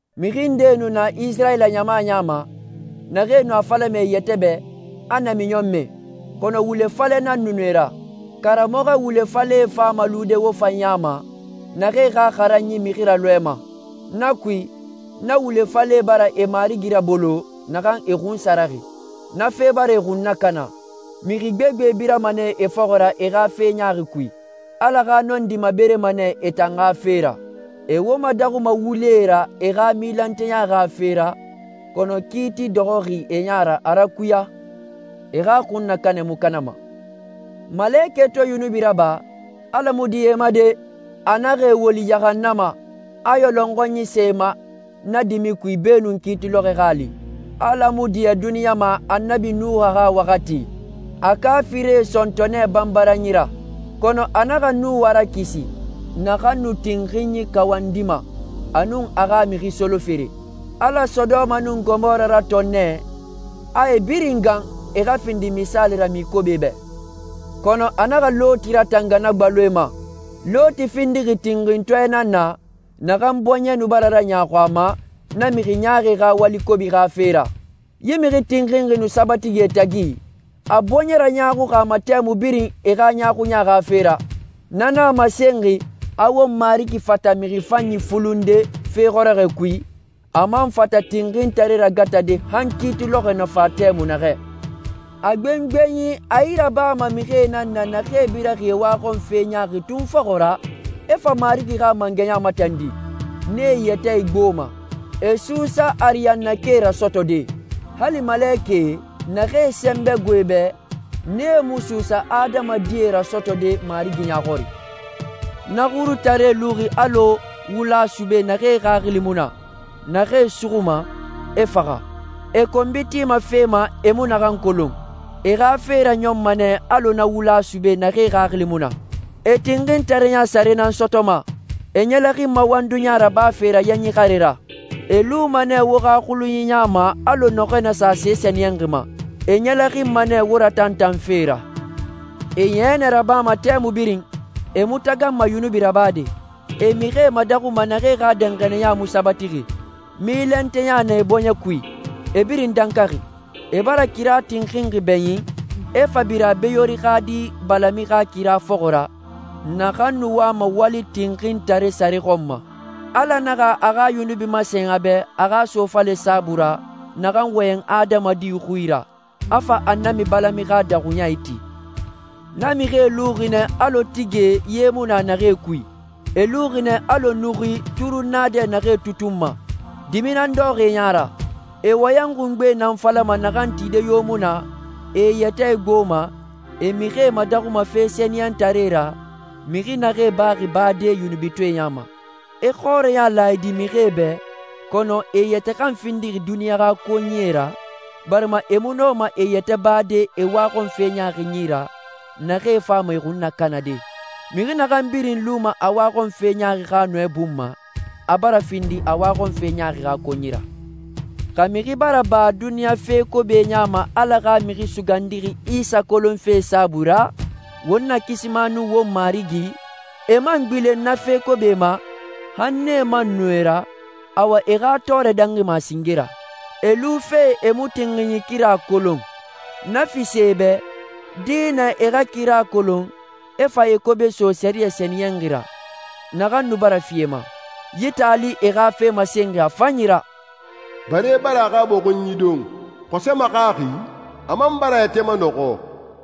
Mixi ndee nu na Isirayila ɲama ya ma, naxee nu a falama e yɛtɛ bɛ, a namiɲɔnmɛe, kɔnɔ wule falɛe nan nu nee ra. Karamɔxɔ wule falɛe fama lude wo fan ya ma, naxee xa xaranyi mixi ralɔɛma. Na kui, na wule falɛe bara e Marigi rabolo, naxan e xunsaraxi. Na fe bara e xun nakana. Mixi gbegbe birama nɛ e fɔxɔ ra e xa fe ɲaaxi kui. Ala xa nɔndi maberema nɛ e tan xa fe ra. E wo madaxuma wulee ra e xa milanteya xa fe ra, kɔnɔ kiiti dɔxɔxi e ya ra a rakuya. E xa xunnakanɛ mu kanama. Malekɛe to yunubi raba, Ala mu diɲɛ e ma de! A naxa e woli yahannama, a yɔlɔnxɔnyie sa e ma na dimi kui beenun kiiti lɔxɔɛ xa a li. Ala mu diɲɛ duniɲa ma Annabi Nuha xa waxati, a kaafirie sɔntɔ nɛ banbaranyi ra. Kɔnɔ a naxa Nuha rakisi, naxan nu tinxinyi kawandima, a nun a xa mixi solofere. Ala Sodoma nun Gomora ratɔn nɛ, a e birin gan, e xa findi misaali ra mixi kobie bɛ. Kɔnɔ a naxa Loti ratanga na gbaloe ma. Loti findixi tinxintɔɛ nan na, naxan bɔɲɛ nu bara raɲaaxu a ma na mixi ɲaaxie xa wali kobie xa fe ra. Yi mixi tinxinxi nu sabatixi e tagi, a bɔɲɛ raɲaaxuxi a ma tɛmui birin e xa ɲaaxuɲa xa fe ra. Na nan a masenxi, a won Marigi fata mixi fanyi fulunde fe xɔrɔxɔɛ kui, a man fata tinxintaree ragatade han kiiti lɔxɔɛ na fa tɛmui naxɛ. A gbengbenyi, a yi rabama mixie nan na naxee biraxi e waxɔnfe ɲaaxi tun fɔxɔ ra, e fa Marigi xa mangɛya matandi. Nee e yɛtɛ igboma. E suusa ariyannakae rasɔtɔde. Hali malekɛe, naxee sɛnbɛ gbo e bɛ, nee mu suusa adamadie rasɔtɔde Marigi ya xɔri. Na xurutaree luxi alɔ wula sube naxee xaxili mu na, naxee suxuma, e faxa. E konbi tima fee ma, e mu naxee kolon. E xa fe raɲɔnma nɛ alɔ na wula sube naxee xaxili mu na. E tinxintareya sare nan sɔtɔma. E ɲɛlɛxinma wanduya rabafe ra yanyi xare ra. E luma nɛ wo xa xulunyie ya ma alɔ nɔxɔɛ na sa se sɛniyɛnxi ma. E ɲɛlɛxinma nɛ wo ratantanfe ra. E yɛnɛ rabama tɛmui birin. E mu taganma yunubi rabade. E mixie madaxuma naxee xa danxaniya mu sabatixi. Milanteya na e bɔɲɛ kui. E birin dankaxi. E bara kira tinxinxi bɛɲin, e fa bira Beyori xa di Balami xa kira fɔxɔ ra, naxan nu wama wali tinxintare sare xɔn ma. Ala naxa a xa yunubi masen a bɛ a xa sofale saabui ra naxan wɔyɛn adamadi xui ra, a fa Annabi Balami xa daxuɲa iti. Na mixie luxi nɛ alɔ tigie ye mu na naxee kui. E luxi nɛ alɔ nuxuie, turunnaadɛ naxee tutunma. Dimi nan dɔxɔxi e ya ra. E wɔyɛn xungbe nan falama naxan tide yo mu na, e e yɛtɛ igboma, e mixie madaxuma fe sɛniyɛntaree ra, mixi naxee baxi bade yunubitɔɛe ya ma. E xɔrɛya laayidi mixie bɛ, kɔnɔ e yɛtɛ kan findixi duniɲa xa konyie ra, barima e mu nɔma e yɛtɛ bade e waxɔnfe ɲaaxie yi ra naxee fama e xun nakanade. Mixi naxan birin luma a waxɔnfe ɲaaxi xa nɔɛ bun ma, a bara findi a waxɔnfe ɲaaxi xa konyi ra. Xa mixi bara ba duniɲa fe kobie ya ma Ala xa Mixi Sugandixi Isa kolonfe saabui ra, won Nakisima nun won Marigi, e man gbilen na fee ma, han nee man nɔ e ra, awa e xa tɔɔrɛ dangima a singe ra. E lufe e mu tinxinyi kira kolon, na fisa e bɛ, dinɛ e xa na kira kolon, e fa e kobe so sɛriyɛ sɛniyɛnxi ra, naxan nu bara fi e ma. Yi taali e xa fe masenma a fanyi ra: «Bare bara a xa bɔxunyi don. Xɔsɛ maxaxi, a man bara a yɛtɛ manɔxɔ.»